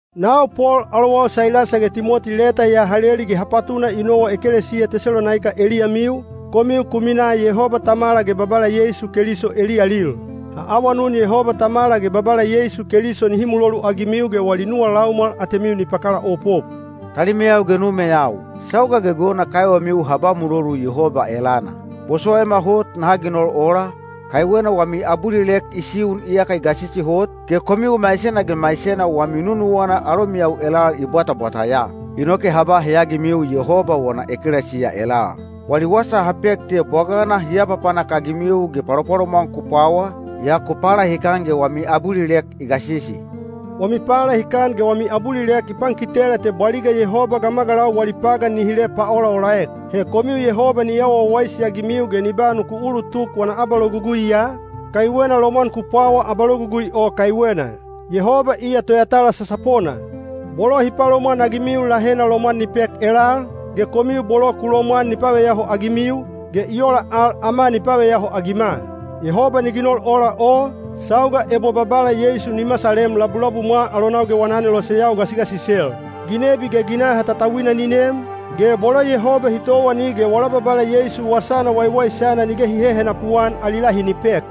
Nau Pol alowau Sailasa ge Timoti leta ya ha leli ge ha patuna i nowa ekelesiya Tesalonaika eliyamiu, komiu ku minaa Yehoba Tamala ge Babala Yeisu Keliso eliyalil. Ha awanun Yehoba Tamala ge Babala Yeisu Keliso nihi muloluagimiu ge wali nuwa laumwal atemiu ni pakalaopop. Talimeyau ge numeyau, sauga gegewena kaiwemiu ha ba mulolu Yehoba elana. Bosowaima hot naha ginol ola, kaiwena wami abulilek i siun iyaka i gasisi hot, ge komiu maisena ge maisena wami nunuwana alomiyau elal i bwatabwata ya. Inoke ha ba heyagimiu Yehoba wana ekelesiya elal. Wali wasa ha pek te bwagana hi apapanak-agimiu ge palopalomwan ku pwawa, yaa ku palahikan ge wami abulilek i gasisi. Wami palahikan ge wami abulilek i pankitela te bwaliga Yehoba gamagalau wali pagan ni hile paolaolaek. He komiu Yehoba ni awa wawaisi-agimiu ge ni ba nuku ulutuk wana abaloguguiya, kaiwena lomwan ku pwawa abalogugui o kaiwena. Yehoba iya toyatala sasapona: bolo hi palomwanagimiu lahena lomwan ni pek elal, ge komiu bolo ku lomwan ni paveyaho-agimiu, ge i ola al ama ni paveyaho-agima. Yehoba ni ginol ola o, sauga ebo Babala Yeisu ni masalem labulabumwa alonau ge wana aneloseyau gasigasisel. Ginebi ge ginaha tautauina ni nem, ge bolo Yehoba hi towani ge wala Babala Yeisu Wasana Waiwaisana nige hi hehenapu-an ali lahi ni pek.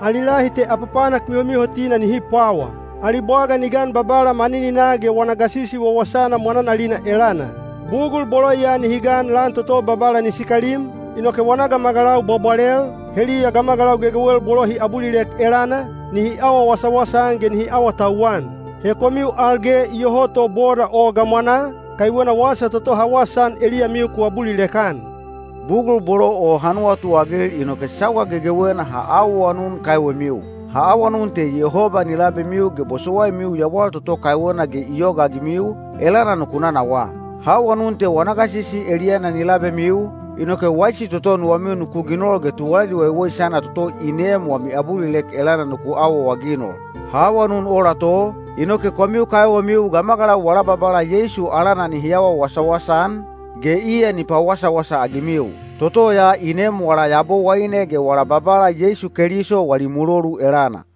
Ali lahi te apapanak mihomihotina nihi pwawa. Ali bwaga ni gan Babala manininaa ge wana gasisi wawasana mwananalina elana. Bugul bolo ya nihi gan lan toto Babala ni sikalim, inoke wana gamagalau bwabwalel, heliya gamagalau gegewel bolo hi abulilek elana, nihi awa wasawasa-an ge nihi awatauwan. He komiu al ge iyoho to boda o gamwanaa, kaiwena wasa toto ha wasaan eliyamiu ku abulilek-an. Bugul bolo o ha nuwatuagil inoke sauga gegewena ha awaawanun kaiwemiu. Ha awanun te Yehoba ni labemiu ge bosowaimiu yawal toto kaiwena ge i yogaagimiu, elana nuku nanawaa. Ha awanun te wana gasisi eliyana ni labemiu, inoke waisi toto nuwamiu nuku ginol ge tuwalali waiwaisana toto i neem wami abulilek elana nuku awaawaginol. Ha awanun ola to, inoke komiu kaiwemiu gamagalau wala Babala Yeisu alana nihi awa wasawasa-an, ge iya ni pawasawasa-agimiu. Toto ya i neem wala Yabowaine ge wala Babala Yeisu Keliso wali mulolu elana.